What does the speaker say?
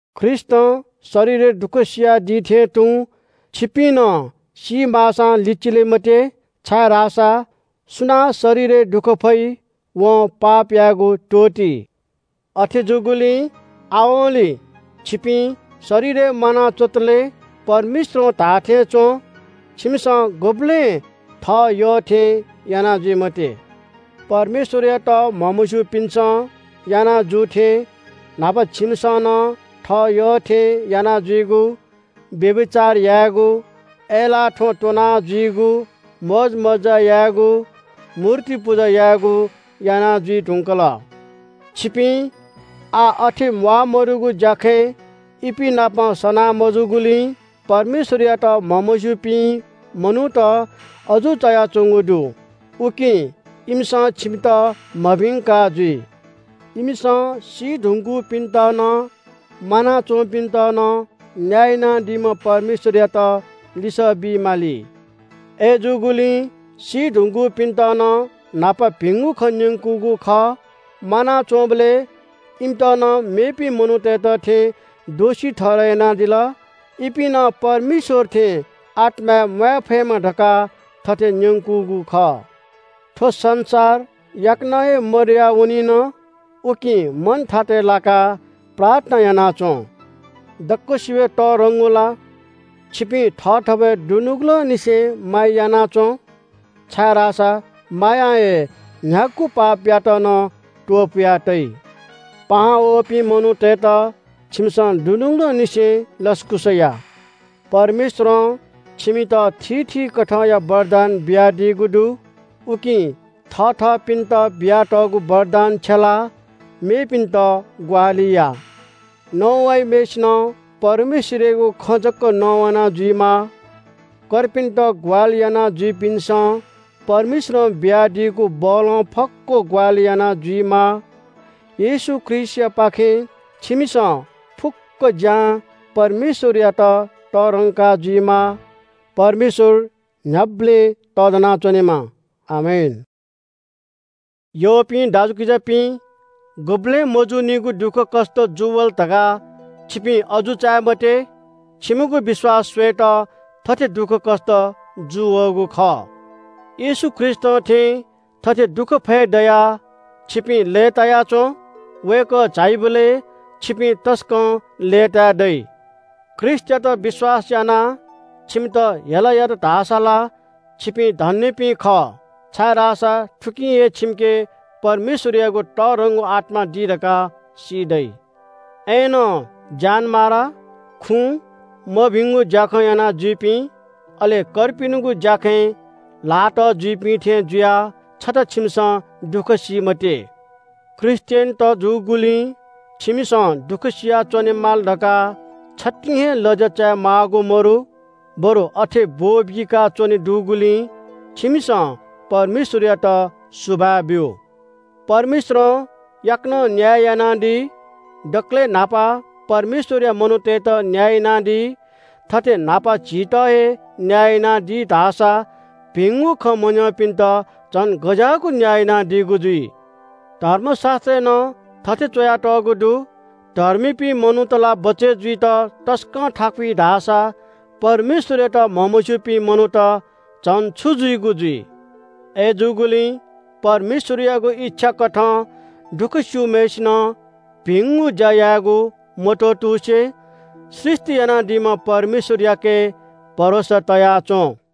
ख्रीष्‍टं शरीरय् दुःख सियादी थें तुं छिपिं नं सीमाःसां लिचिले मते, छाय्‌धाःसा सुनां शरीरय् दुःख फइ, वं पाप यायेगु त्‍वःती। अथे जूगुलिं आवंलि छिपिं शरीरय् म्‍वाना च्‍वंतले परमेश्‍वरं धाःथें च्‍वँ। छिमिसं गुबलें थः यःथें याना जुइ मते। परमेश्‍वरयात म्‍हमस्‍यूपिन्‍सं याना जू थें न्‍हापा छिमिसं नं थः यःथें यानाजुइगु, व्‍यभिचार यायेगु, अय्‌लाः थ्‍वँ त्‍वना जुइगु, मोजमज्‍जा यायेगु, मूर्ति पुजा यायेगु याना जुइ धुंकल। छिपिं आः अथे म्‍वाःमदुगु ज्‍याखँय् इपिं नाप सना मजूगुलिं परमेश्‍वरयात म्‍हमस्‍यूपिं मनूत अजू चायाच्‍वंगु दु। उकिं इमिसं छिमित मभिंका जुइ। इमिसं सी धुंकूपिन्‍त नं म्‍वानाच्‍वंपिन्‍त नं न्‍याय यानादीम्‍ह परमेश्‍वरयात लिसः बी माली। अय्‌जूगुलिं सी धुंकूपिन्‍त नं न्‍हापा भिंगु खँ न्‍यंकूगु खः। म्‍वानाच्‍वंबलय् इमित नं मेपिं मनूतय्‌त थें दोषी ठहरय् यानादिल। इपिं नं परमेश्‍वर थें आत्‍माय् म्‍वाये फयेमा धकाः थथे न्‍यंकूगु खः। थ्‍व संसार याकनं हे मदया वनिन। उकिं मन थातय् लाकाः प्रार्थना याना च्‍वँ। दक्‍वसिबय् तःधंगु ला, छिपिं थःथवय् दुनुगलंनिसें माया याना च्‍वँ, छाय्‌धाःसा मायां हे न्‍ह्यागु पापयात नं त्‍वपुया तइ। पाहां वःपिं मनूतय्‌त छिमिसं दुनुगलंनिसें लसकुस या। परमेश्‍वरं छिमित थीथी कथंया वरदान बियादीगु दु। उकिं थःथपिन्‍त बियातःगु वरदान छ्यलाः मेपिन्‍त ग्‍वाहालि या। नवाइम्‍हय्‌सिनं परमेश्‍वरयागु खँ जक नवाना जुइमाः। कर्पिन्‍त ग्‍वाहालि यानाजुइपिन्‍सं परमेश्‍वरं बियादीगु बलं फक्‍व ग्‍वाहालि याना जुइमाः। येशू ख्रीष्‍टयापाखें छिमिसं फुक्‍क ज्‍यां परमेश्‍वरयात तःधंका जुइमाः। परमेश्‍वर न्‍ह्याबलें तःधना च्‍वनेमा। आमेन। यःपिं दाजुकिजापिं, गुबलें मजूनिगु दुःखकष्‍ट जूवल धकाः छिपिं अजू चाये मते। छिमिगु विश्‍वास स्‍वयेत थथे दुःखकष्‍ट जूवःगु खः। येशू ख्रीष्‍टं थें थथे दुःख फये दयाः छिपिं लय्‌ताया च्‍वँ। वय्‌कः झाइबलय् छिपिं तसकं लय्‌ताये दइ। ख्रीष्‍टयात विश्‍वास यानाः छिमित हेला यात धाःसा ला छिपिं धन्‍यपिं खः, छाय्‌धाःसा थुकिं हे छिमिके परमेश्‍वरयागु तःधंगु आत्‍मा दी धकाः सी दइ। अय्‌नं ज्‍यानमारा, खुँ, मभिंगु ज्‍याखँ यानाजुइपिं, अले कर्पिनिगु ज्‍याखँय् ल्‍हाः तः जुइपिं थें जुयाः छता छिमिसं दुःखकष्‍ट सी मते। ख्रीष्‍टियनत जूगुलिं छिमिसं दुःखसिया च्‍वनेमाल धकाः छतिं हे लज्‍या चायेमाःगु मदु, बरु अथे ब्‍वःबीकाच्‍वने दुगुलिं छिमिसं परमेश्‍वरयात सुभाय् ब्‍यु। परमेश्‍वरं याकनं न्‍याय यानादी। दकलय् न्‍हापा परमेश्‍वरया मनूतय्‌त न्‍याय यानादी। थथे न्‍हापा झीत हे न्‍याय यानादी धाःसा भिंगु खँ मन्‍यंपिन्‍त झन गज्‍याःगु न्‍याय यानादीगु जुइ? धर्मशास्‍त्रय् नं थथे च्‍वयातःगु दु – “धर्मीपिं मनूत ला बचय् जुइत तसकं थाकुइ धाःसा परमेश्‍वरयात म्‍हमस्‍यूपिं मनूत झन छु जुइगु जुइ?” अय्‌जूगुलिं परमेश्‍वरयागु इच्‍छा कथं दुःख स्‍यूम्‍हय्‌सिनं भिंगु ज्‍या यायेगु मत्‍वःतुसे सृष्‍टि यानादीम्‍ह परमेश्‍वरयाके भरोसा तया च्‍वँ।